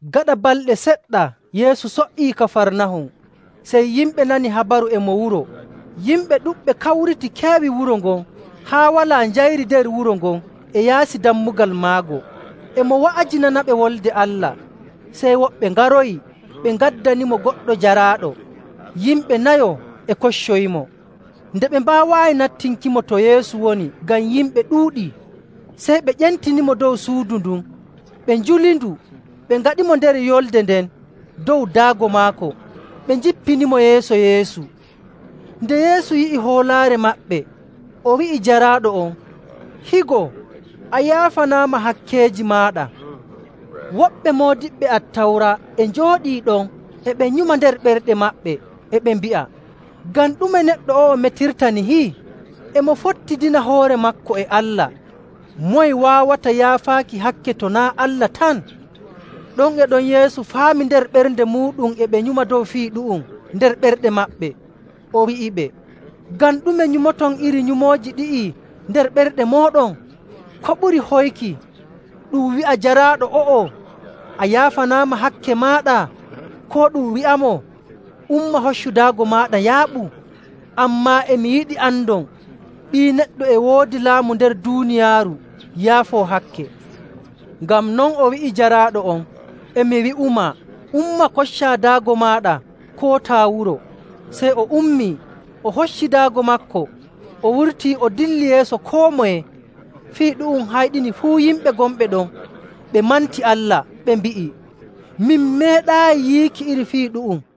Gaɗa balɗe seɗɗa Yeesu so''ii Kafarnahum. Sey yimɓe nani habaru e mo wuro. Yimɓe ɗuɗɓe kawriti keewi wuro ngon haa walaa njayri nder wuro ngon e yaasi dammugal maago. E mo wa'ajinanaɓe Wolde Allah. Sey woɓɓe ngaroyi, ɓe ngaddanimo goɗɗo jaraaɗo, yimɓe nayo e koccoyimo. Nde ɓe mbaawaayi nattinkimo to Yeesu woni ngam yimɓe ɗuuɗii, sey ɓe ƴentinimo dow suudu ndun, ɓe njulindu, ɓe ngaɗimo nder yulnde nden dow daago maako, ɓe njippinimo yeeso Yeesu. Nde Yeesu yi'i hoolaare maɓɓe, o wi'i jaraaɗo on, “Higo, a yaafanaama hakkeeji maaɗa.” Woɓɓe moodiɓɓe Attawra e njooɗii ɗon e ɓe nyuma nder ɓerɗe maɓɓe, e ɓe mbi'a, “Ngam ɗume neɗɗo o'o metirta nihi? E mo fottidina hoore maako e Allah! Moye waawata yaafaaki hakke to naa' Allah tan?” Ɗon e ɗon Yeesu faami nder ɓernde muuɗum e ɓe nyuma dow fii ɗu'um nder ɓerɗe maɓɓe, o wi'iɓe, “Ngam ɗume nyumoton iri nyumooji ɗi'i nder ɓerɗe mooɗon? Ko ɓuri hoyki, ɗum wi'a jaraaɗo o'o, ‘A yaafanaama hakke maaɗa,’ koo ɗum wi'amo, ‘Umma hoccu daago maaɗa, yaaɓu?’ Ammaa e mi yiɗi andon Ɓii Neɗɗo e woodi laamu nder duuniyaaru yaafoo hakke.” Ngam non o wi'i jaraaɗo on, “E mi wi'umaa, umma, koccaa daago maaɗa, kootaa wuro.” Sey o ummii, o hocci daago maako, o wurtii, o dilli yeeso koo moye. Fii ɗu'um hayɗini fuu yimɓe gonɓe ɗon, ɓe manti Allah, ɓe mbi'i, “Min meeɗaayi yiiki iri fii ɗu'um!”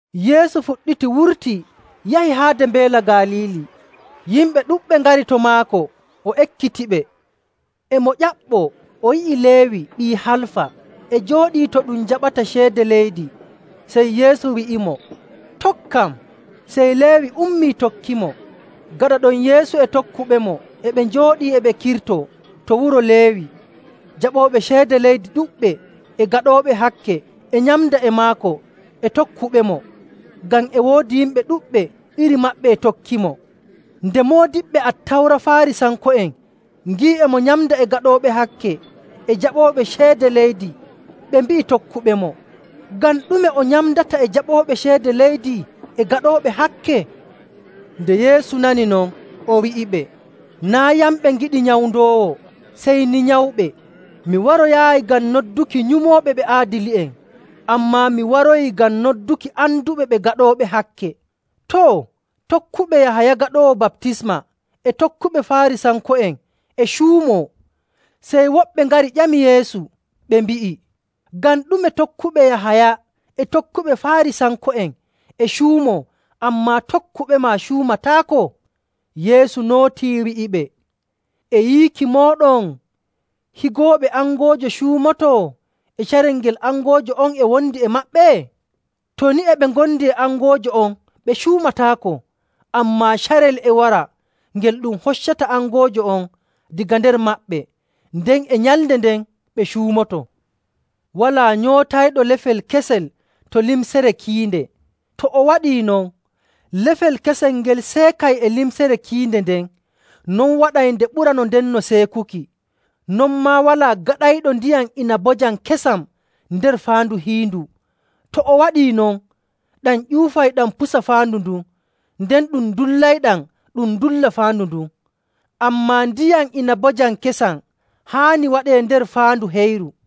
Yeesu fuɗɗiti wurtii yahi haade Mbeela Galiili. Yimɓe ɗuɗɓe ngari to maako o ekkitiɓe. E mo ƴaɓɓoo, o yi'i Leewi ɓii Halfa e jooɗii to ɗum jaɓata ceede leydi, sey Yeesu wi'imo, “Tokkam.” Sey Leewi ummii tokkimo. Gaɗa ɗon Yeesu e tokkuɓemo e ɓe njooɗii e ɓe kirtoo to wuro Leewi. Jaɓooɓe ceede leydi ɗuɗɓe e gaɗooɓe hakke e nyamda e maako e tokkuɓemo, ngam e woodi yimɓe ɗuɗɓe iri maɓɓe e tokkimo. Nde moodiɓɓe Attawra Faarisanko'en ngi'i e mo nyamda e gaɗooɓe hakke e jaɓooɓe ceede leydi, ɓe mbi'i tokkuɓemo, “Ngam ɗume o nyamdata e jaɓooɓe ceede leydi e gaɗooɓe hakke?” Nde Yeesu nani non, o wi'iɓe, “Naa' yamɓe ngiɗi nyawndoowo, sey ni nyawɓe. Mi waroyaayi ngam nodduki nyumooɓe ɓe aadili'en, ammaa mi waroyi ngam nodduki anduɓe ɓe gaɗooɓe hakke.” Too, tokkuɓe Yahaya Gaɗoowo Baptisma e tokkuɓe Faarisanko'en e cuumoo. Sey woɓɓe ngari ƴami Yeesu, ɓe mbi'i, “Ngam ɗume tokkuɓe Yahaya e tokkuɓe Faarisanko'en e cuumoo, ammaa tokkuɓema cuumataako?” Yeesu nootii, wi'iɓe, “E yiiki mooɗon higooɓe angoojo cuumoto e carel ngel angoojo on e wondi e maɓɓe? To ni e ɓe ngondi e angoojo on, ɓe cuumataako. Ammaa carel e wara ngel ɗum hoccata angoojo on daga nder maɓɓe, nden e nyalnde nden ɓe cuumotoo. “Walaa nyootayɗo lefel kesel to limcere kiinde. To o waɗii non, lefel kesel ngel seekay e limcere kiinde nden. Non waɗay nde ɓura no ndenno seekuki. Non maa walaa gaɗayɗo ndiyam inabojam kesam nder faandu hiindu. To o waɗii non, ɗam ƴuufay ɗam pusa faandu ndun, nden ɗum dullayɗam, ɗum dulla faandu ndun. Ammaa ndiyam inabojam kesam haani waɗee nder faandu heyru.”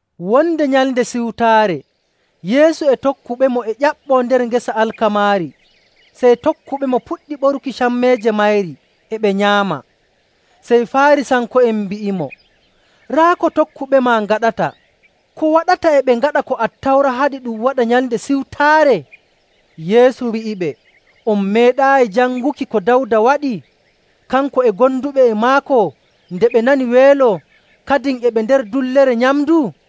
Wonde Nyalnde Siwtaare Yeesu e tokkuɓemo e ƴaɓɓoo nder gese alkamaari, sey tokkuɓemo puɗɗi ɓoruki cammeeje mayri e ɓe nyaama.. Sey Faarisanko'en mbi'imo, “Raa ko tokkuɓema ngaɗata. Ko waɗata e ɓe ngaɗa ko Attawra haɗi ɗum waɗa Nyalnde Siwtaare?” Yeesu wi'iɓe, “On meeɗaayi janguki ko Dawda waɗi, kanko e gonduɓe e maako nde ɓe nani weelo kadin e ɓe nder dullere nyamndu?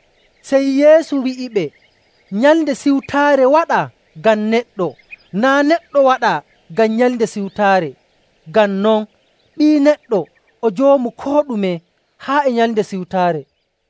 Sey Yeesu wi'iɓe, “Nyalnde Siwtaare waɗaa ngam neɗɗo, naa' neɗɗo waɗaa ngam Nyalnde Siwtaare. Ngam non Ɓii Neɗɗo o Joomu koo ɗume haa e Nyalnde Siwtaare.”